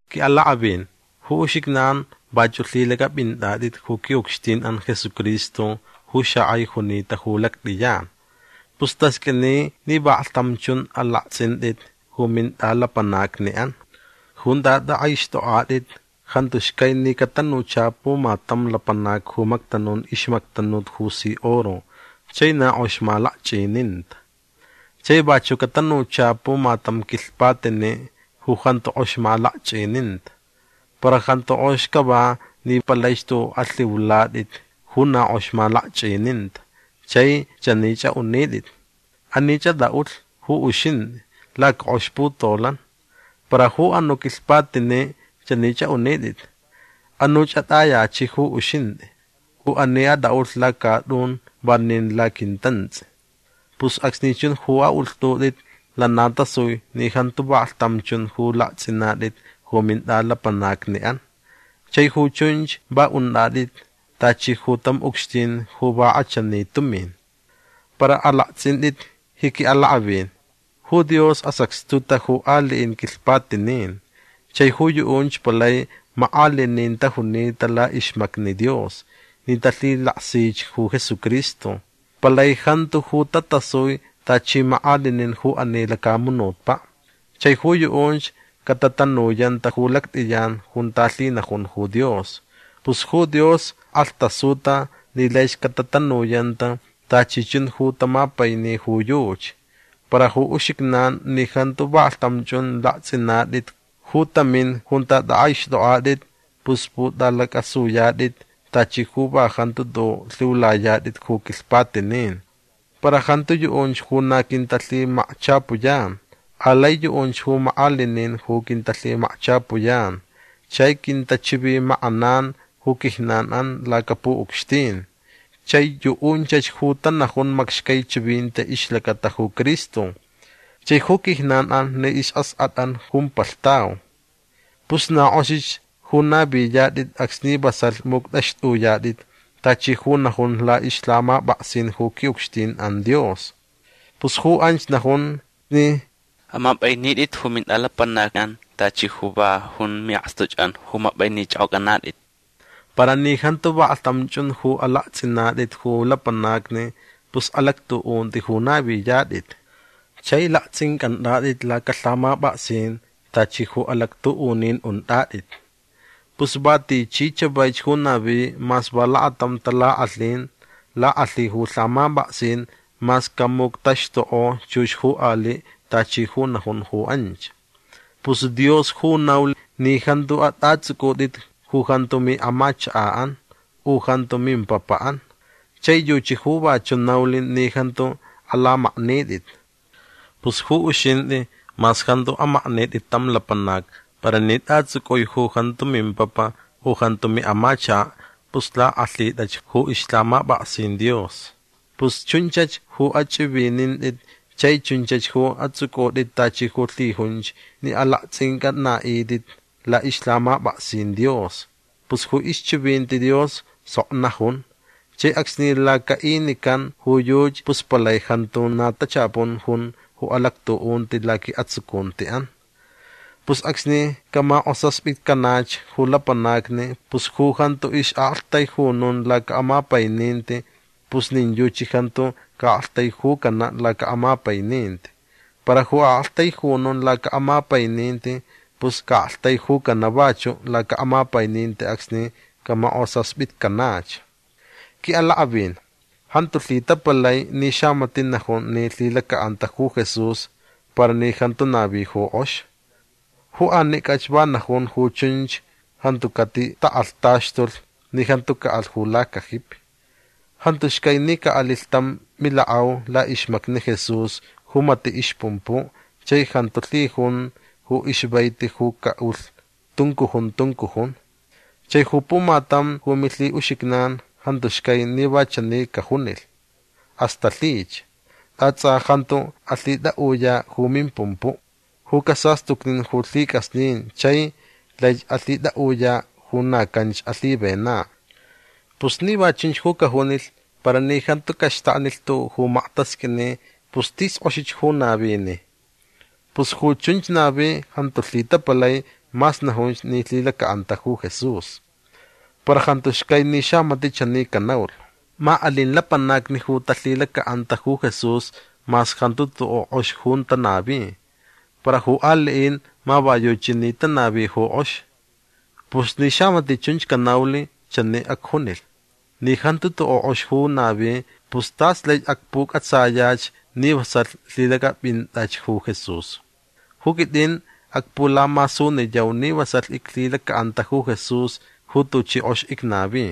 Quiʼalakʼavin ju uxijnan vachuʼ lhilacʼapʼintʼatʼit ju quiʼucxtinʼan Jesucristo ju xakʼai junita ju lactʼiyan. Pus tasqʼuini ni vaklhtam chun alaktsʼintʼit ju mintʼalapanacniʼan. Junta tʼakʼaixtʼokʼatʼit jantu xcai ni catanucha pumatam lapanac ju mactanun ixmactanut ju si oro chai na kʼox malakchʼininta. Chai vachuʼ catanucha pumatam quilhpatiniʼ ju jantu kʼox malakchʼininta. Para jantu kʼox cava ni palaich tuʼuʼ alhiulatʼit ju na kʼox malakchʼininta chai chanich aʼunitʼit: “Anich atʼaʼulh ju uxintʼi lacakʼox putolan”. Para ju anuʼ quilhpatiniʼ chanich aʼunitʼit: “Anuch atʼayachiʼ ju uxintʼi u ani atʼaʼulh lacatʼun vanin laquintantsʼi”. Pus acsni chun ju aʼulhtʼutʼit lana tasui ni jantu vaklhtam chun ju laktsʼinatʼit ju mintʼalapanacniʼan. Chai ju chunch va untʼatʼit tachi ju tam ucxtin ju va kʼachani tumin. Para alaktsʼintʼit ji quiʼalakʼavin. Ju Dios asacxtuta ju aliʼin quilhpatinin. Chai ju yuʼunch palai makʼalinin tajunita laʼixmacni Dios ni talhilaksich ju Jesucristo. Palai jantu ju tatasui tachi makʼalinin ju ani lacamunutpaʼ. Chai ju yuʼunch catatanuyanta ju lactʼiyan junta lhinajun ju Dios. Pus ju Dios kʼalhtasuta ni laich catatanuyanta tachi chun ju tamapaini ju yuchi. Para ju uxijnan ni jantu vaklhtam chun laktsʼinatʼit ju tamin junta tʼakʼaixtʼokʼatʼit pus pʼutʼalacʼasuyatʼit tachi ju va jantu tuʼuʼ lhiulayatʼit ju quilhpatinin. Para jantu yuʼunch ju na quintalhimakchapuyan. Alai yuʼunch ju makʼalinin ju quintalhimakchapuyan chai quintachivimakʼanan ju quijnanʼan lacapuʼucxtin. Chai yuʼunchach ju tanajun macxcai chivinti ixlacata ju Cristo. Chai ju quijnanʼan ni isʼaskʼatʼan jumpalhtau. Pus na kʼoxich ju naviyatʼit acsni vasalh muctʼaxtʼuyatʼit tachi ju najun laʼixlhamapʼaksin ju quiʼucxtinʼan Dios. Pus ju anch najun ni amapʼainitʼit ju mintʼalapanacʼan tachi ju va jun miʼakstuchʼan ju mapʼainichʼokʼocʼanatʼit. Para ni jantu vaklhtam chun ju alaktsʼinatʼit ju lapanacni pus alactuʼunti ju naviyatʼit. Chai laktsʼincʼantʼatʼit lacalhamapʼaksin tachi ju alactuʼunin untʼatʼit. Pus va tichi chavaich ju navi mas va lakatam talakʼalhin lakʼalhi ju lhamapʼaksin mas camuctaxtukʼo chux ju aliʼ tachi ju najun ju anch. Pus Dios ju naulh ni jantu atʼatsʼucʼutʼit ju jantu miʼamachakaʼan u ju jantu mimpapaʼan. Chai yuchi ju vachuʼ naulh ni jantu alamaknitʼit. Pus ju uxintʼi mas jantu amaknitʼi tam lapanac para ni tʼatsʼucʼui ju jantu mimpapa u ju jantu miʼamachakaʼ pus lakʼalhitʼach ju ixlhamapʼaksin Dios. Pus chunchach ju achʼivinintʼit chai chunchach ju atsʼucʼutʼit tachi ju lhijunch ni alaktsʼincʼanaʼitʼit laʼixlhamapʼaksin Dios. Pus ju ixchivinti Dios sok najun chai acsni lacaʼinican ju yuchi pus palai jantu na tachapun jun ju alactuʼunti laquiʼatsucuntiʼan. Pus acsni camakʼosaspitcanach ju lapanacni pus ju jantu ixʼaʼaktaijunun lacaʼamapaininti pus nin yuchi jantu caʼaktaijucanaʼ lacaʼamapaininti. Para ju aʼaktaijunun lacaʼamapaininti pus caʼaktaijucanaʼ vachuʼ lacaʼamapaininti acsni camakʼosaspitcanach. Quiʼalakʼavin jantu lhitapalai ni xamatiʼ najun ni lhilacaʼanta ju Jesús para ni jantu navi ju kʼox. Ju anicʼach va najun ju chunch jantu catitakʼalhtaxtulh ni jantu caʼalh ju lacajipi. Jantu xcai ni caʼalilh tam milakʼau laʼixmacni Jesús ju matiʼ ixpumpuʼ chai jantu lhijun ju ixvaiti ju caʼulh tuncujun tuncujun. Chai ju pumatam ju milhiʼuxijnan jantu xcai ni va chani cajunilh: “Asta lhich. Ta tsʼa jantu alhitʼaʼuyaʼ ju mimpumpuʼ ju casastucnin ju lhicʼasnin chai laich alhitʼaʼuyaʼ ju na canch alhivenaʼ”. Pus ni va chunch ju cajunilh para ni jantu caxtaknilh tuʼuʼ ju maktasqʼuini pus tis kʼoxich ju navini. Pus ju chunch navi jantu lhitapalai mas najunch ni lhilacaʼanta ju Jesús. Para jantu xcai ni xamatiʼ chani canaulh: “Ma alin lapanacni ju talhilacaʼanta ju Jesús mas jantu tuʼuʼ kʼox ju tanavi. Para ju aliʼin ma va yuchi ni tanavi ju kʼox”. Pus ni xamatiʼ chunch canaulh chani acjunilh: “Ni jantu tuʼuʼ kʼox ju navi pus tas laich acpucʼatsayach ni vasalh lhilacʼapʼintʼach ju Jesús. Ju quitʼin acpulamasuniyau ni vasalh iclhilacaʼanta ju Jesús ju tuchi kʼox icnavi”.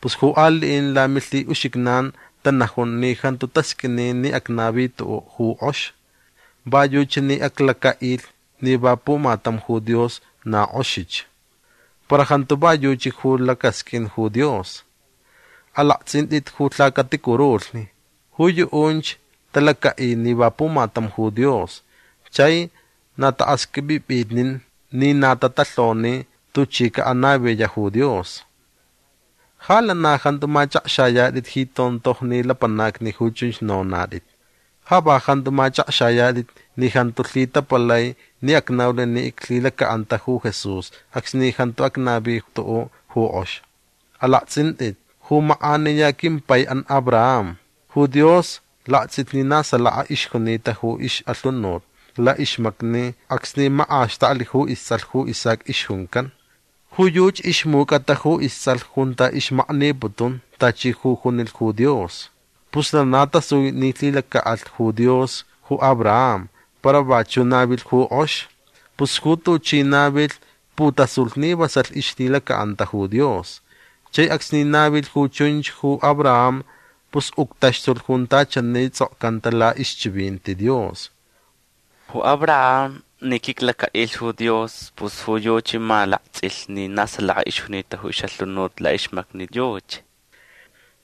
Pus ju aliʼin lamilhiʼuxijnan tanajun ni jantu tasqʼuini ni acnavi tuʼuʼ ju kʼox. Va yuchi ni aclacaʼilh ni va pumatam ju Dios. Na kʼoxich. Para jantu va yuchi ju lacasqʼuin ju Dios. Alaktsʼintʼit ju lhacaticurulhni. Ju yuʼunch talacaʼi ni va pumatam ju Dios chai na taʼaxqʼuipʼipʼitnin ni na tatalhoni tuchi caʼanaviyaʼ ju Dios. Ja lana jantu machʼakxayatʼit ji tontojni lapanacni ju chunch nonatʼit. Ja va jantu machʼakxayatʼit ni jantu lhitapalai ni acnaulh ni iclhilacaʼanta ju Jesús acsni jantu acnavi tuʼuʼ ju kʼox. Alaktsʼintʼit ju makʼaniya quimpaiʼan Abraham. Ju Dios laktsʼilh ni na salaka ixjunita ju ixʼalhunut laʼixmacni acsni makʼaxtaklh ju istsʼalh ju Isaac ixjuncan. Ju yuchi ixmucʼata ju istsʼalh junta ixmakniputun tachi ju junilh ju Dios. Pus lana tasui ni lhilacaʼalh ju Dios ju Abraham para vachuʼ navilh ju kʼox. Pus ju tuchi navilh putasulh ni vasalh ixlhilacaʼanta ju Dios. Chai acsni navilh ju chunch ju Abraham pus uctaxtulh junta chani tsʼokcanta laʼixchivinti Dios: “Ju Abraham ni quiclacaʼilh ju Dios pus ju yuchi ma laktsʼilh ni na salaka ixjunita ju ixʼalhunut laʼixmacni yuchi”.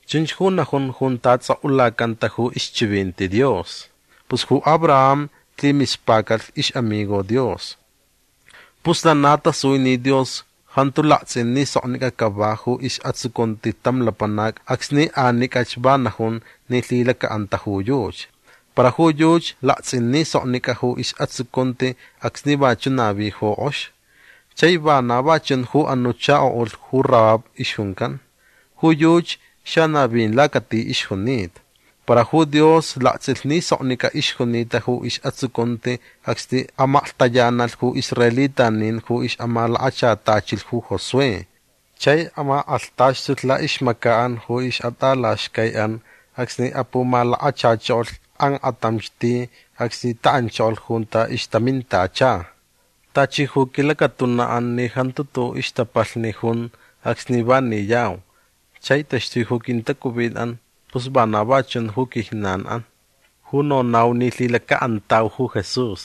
Chunch ju najun junta tsʼokʼulacanta ju ixchivinti Dios. Pus ju Abraham lhimispacalh ixʼamigo Dios. Pus lana tasui ni Dios jantu laktsʼin ni soknicʼa cava ju isʼatsucunti tam lapanac acsni anicʼach va najun ni lhilacaʼanta ju yuchi. Para ju yuchi laktsʼin ni soknicʼa ju isʼatsucunti acsni vachuʼ navi ju kʼox. Chai vana va chun ju anuʼ chakoʼulh ju Rahab ixjuncan. Ju yuchi xanavin lacati ixjunita. Para ju Dios laktsʼilh ni soknicʼa ixjunita ju isʼatsucunti acsni amaklhtayanalh ju israelitanin ju ixʼamalakachatachilh ju Josué. Chai amakʼalhtaxtulh laʼixmacaʼan ju ixʼatʼalaxcaiʼan acsni apumalakachachokolh kakʼantamch ti acsni taʼanchokolh junta ixtamintacha. Tachi ju quilacatunaʼan ni jantu tuʼuʼ ixtapalhni jun acsni va niyau chai taxtui ju quintacuvinʼan pus vana va chun ju quijnanʼan ju nonau ni lhilacaʼantau ju Jesús.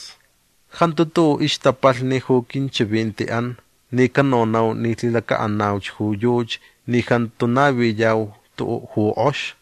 Jantu tuʼuʼ ixtapalhni ju quinchivintiʼan ni canonau ni lhilacaʼanauch ju yuchi ni jantu naviyau tuʼuʼ ju kʼox.